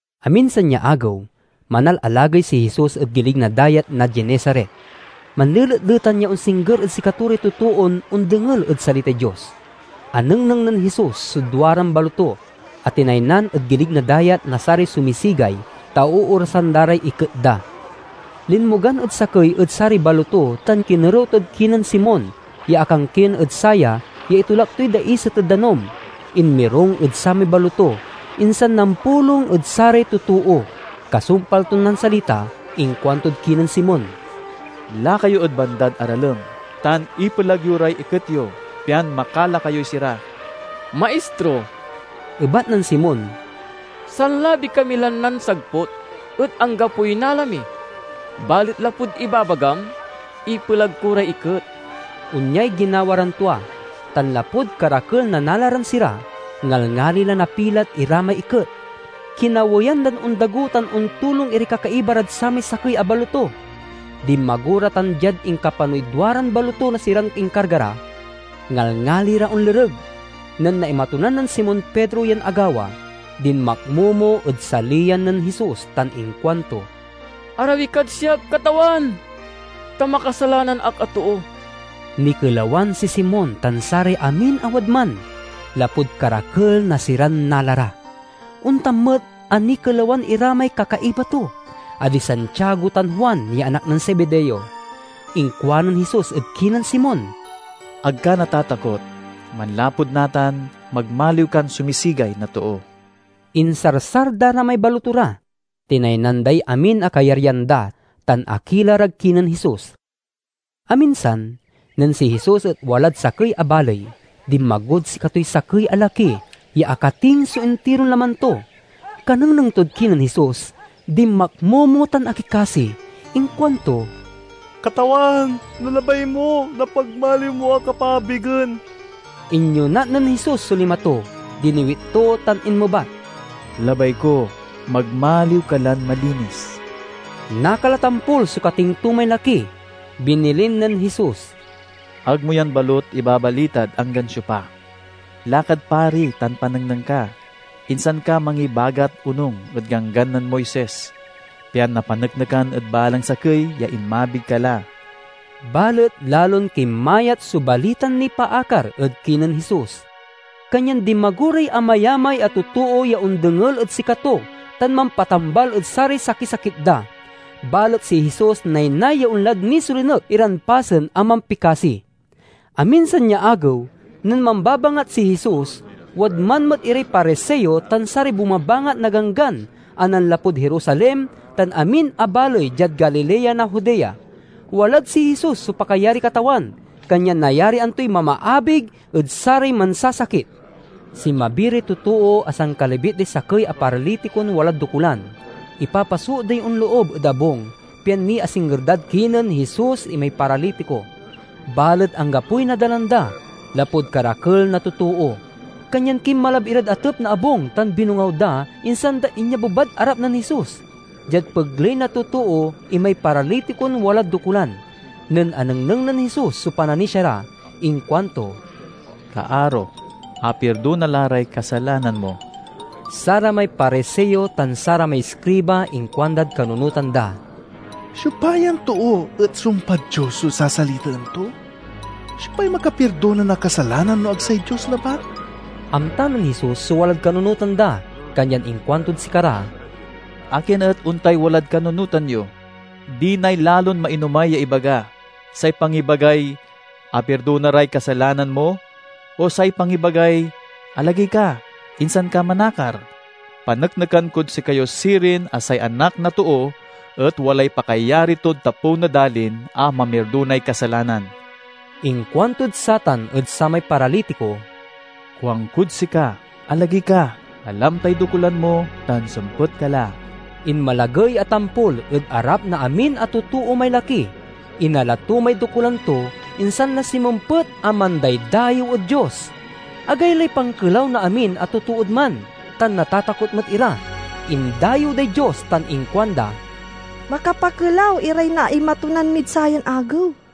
Aminsan ya agew, manalalagey si Jesus ed gilig na Dayat na Genesaret. Manleletletan ya onsingger ed sikato ray totoon ondengel ed salitay Dios. Anengneng nen Jesus so duaran baloto a tinaynan ed gilig na dayat na saray sumisigay, ta oorasan da ray iket da. Linmogan ed sakey ed saray baloto tan kinerew tod kinen Simeon ya akankien ed saya ya itolak toy daiset ed danum. Inmirung ed samay baloto, insan nampulong ed saray totoo. Kasumpal ton nansalita, inkuantod kinen Simon, "Laka yo ed bandad aralem tan ipelag yo ray iket yo, pian makala kayoy sira." "Maistro," ebat nen Simon, "sanlabi kami lan nansagput, et anggapoy nala mi. Balet lapud ibabagam, ipelag ko ray iket." Onyay ginawa ran tua, tan lapud karakel na nala ran sira, ngalngali la napilat ira may iket. Kinaweyan dan ondago tan ontulong iray kakaiba rad samay sakey a baloto. Dinmago ra tan diad inkapanoy duaran baloto na siran inkarga ra, ngalngali ra onlereg. Nen naimatunan nen Simon Pedro yan agawa, dinmakmomo ed saliyan nen Jesus tan inkuanto, "Arawi kad siak, Katawan, ta makasalanan ak a too!" Nikelawan si Simon tan saray amin a wadman, lapud karakel na siran nala ra. Ontan met a nikelawan ira may kakaiba to, a di Santiago tan Juan ya anak nen Zebedeo. Inkuanen Jesus ed kinen Simon, "Ag ka natatakot. Manlapud natan, magmaliw kan sumisigay na too." Insarsar da ra may baloto ra, tinaynan day amin a kayaryan da, tan akila rad kinen Jesus. Aminsan, nen si Jesus et walad sakey a baley, dinmagod sikatoy sakey a laki ya akating so intiron laman to. Kanengneng tod kinen Jesus, dinmakmomo tan akikasi. Inkuanto, "Katawan, no labay mo, napagmaliw mo ak a paabigen!" Inyonat nen Jesus so lima to, diniwit to tan inmebat, "Labay ko. Magmaliw ka lan malinis!" Nakal a tampol so kating to may laki. Binilin nen Jesus, "Ag mo yan balut ibabalitad anggan siopa. Lakad pari tan panengneng ka, insan ka mangibagat onung ed Ganggan nen Moises, pian napaneknekan ed balang sakey ya inmabig ka la." Balet lalon kinmayat so balitan nipaakar ed kinen Jesus, kanyan dinmago ray amayamay a totoo ya ondengel ed sikato tan mampatambal ed saray sakisakit da. Balet si Jesus naynay ya onlad nisolinek iran pasen a mampikasi. Aminsan ya agew nen mambabangat si Jesus, wadman met iray Pariseo tan saray bumabangat na Ganggan a nanlapud Jerusalem tan amin a baley diad Galilea na Judea. Walad si Jesus so pakayariy Katawan, kanyan nayarian toy mamaabig ed saray mansasakit. Sinmabi ray totoo a sankalibit day sakey a paralitikon walad dokulan. Ipapasoot day onloob ed abung pian niasingger dad kinen Jesus imay paralitiko. Balet anggapoy nadalan da, lapud karakel na totoo. Kanyan kinmalab irad atep na abung tan binongaw da, insan da inyabebad arap nen Jesus, diad pegley na totoo imay paralitikon walad dokulan. Nen anengneng nen Jesus so pananisia ra, inkuanto, "Kaaro, apirdona la ray kasalanan mo." Saramay Pariseo tan saramay iskriba inkuandad kanunotan da, "Siopa yan too et sumpad Dios so sasalitaen to? Siopay makapirdona na kasalanan no ag say Dios labat?" Amta nen Jesus so walad kanunotan da, kanyan inkuantod sikara, "Akin et ontay walad kanunotan yo? Dinay lalon mainomay ya ibaga: say pangibagay, 'Apirdona ray kasalanan mo,' o say pangibagay, 'Alagey ka, insan ka manakar'? Paneknekan kod sikayo sirin a say Anak na Too et walay pakayari tod tapew na dalin a mamirdonay kasalanan." Inkuantod satan ed samay paralitiko, "Kuankod sika, alagey ka, alam tay dokulan mo, tan sempet ka la!" Inmalagey a tampol ed arap na amin a totoo may laki, inala to may dokulan to, insan la sinmempet a mandaydayew ed Dios. Agaylay pankelaw na amin a totood man, tan natatakot met ira. Indayew day Dios tan inkuanda, "Makapakelaw iray naimatonan mid sayan agew!"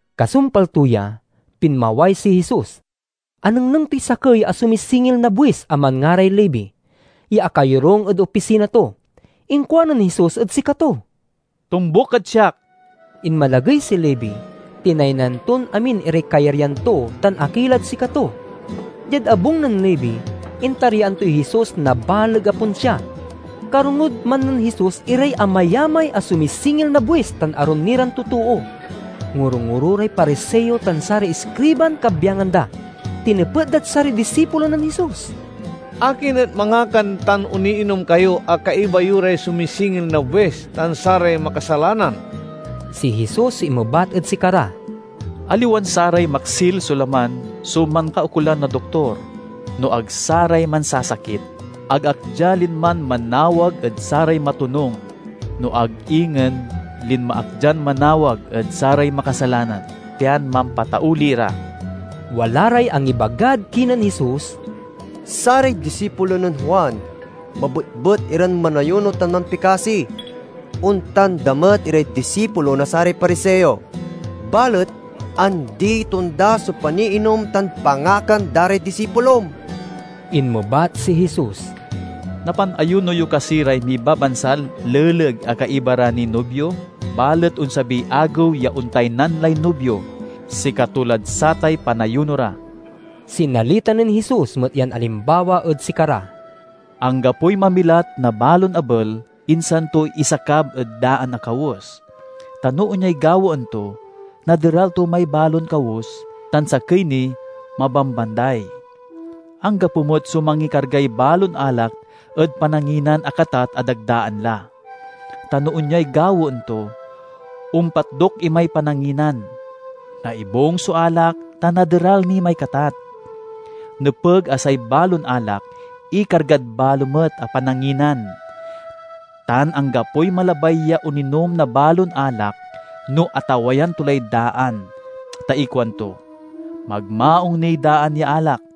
Kasumpal to ya, pinmaway si Jesus. Anengneng toy sakey a sumisingil na buis a manngaray Levi, ya akayorung ed opisina to. Inkuanen Jesus ed sikato, "Tombuk kad siak." Inmalagey si Levi, tinaynan ton amin iray kayaryan to, tan akilad sikato. Diad abung nen Levi, intaryaan toy Jesus na baleg a ponsia. Karongod man nen Jesus iray amayamay a sumisingil na buis tan arum ni ran totoo. Ngoro-ngoro ray Pariseo tan saray iskriban kabyangan da. Tinepet dad saray disipulo nen Jesus, "Akin et mangakan tan oniinom kayo a kaiba yo ray sumisingil na buis tan saray makasalanan?" Si Jesus so inmebat ed sikara, "Aliwan saray maksil so laman so mankaukolan na doktor, no ag saray mansasakit. Ag ak dia linman manawag ed saray matonung, no ag ingen linma ak dian manawag ed saray makasalanan, pian mampatauli ra." Wala ray angibagad kinen Jesus, "Saray disipulo nen Juan mabetbet iran manayuno tan mampikasi; ontan da met iray disipulo na saray Pariseo. Balet andi-tonda so paniinom tan pangakan da ray disipulom." Inmebat si Jesus, "Napanayuno yo kasi ray mibabansal leleg a kaiba ra niy nubio? Balet onsabiy agew ya ontaynan lay nubio; sikato lad satay panayuno ra." Sinalita nen Jesus met yan alimbawa ed sikara, "Anggapoy mamilat na balon abel, insan to isakab ed daan a kawes. Ta no onyay gawaen to, naderal to may balon kawes, tan sakey ni, mabambanday. Anggapo met so mangikargay balon alak ed pananginan a katat a dagdaan la. Ta no onyay gawaen to, ompatdok imay pananginan, naibung so alak, tan naderal ni may katat. Nepeg a say balon alak ikargad balo met a pananginan! Tan anggapoy malabay ya oninom na balon alak no atawayan to lay daan, ta ikuanto, 'Magmaung niy daan ya alak!'"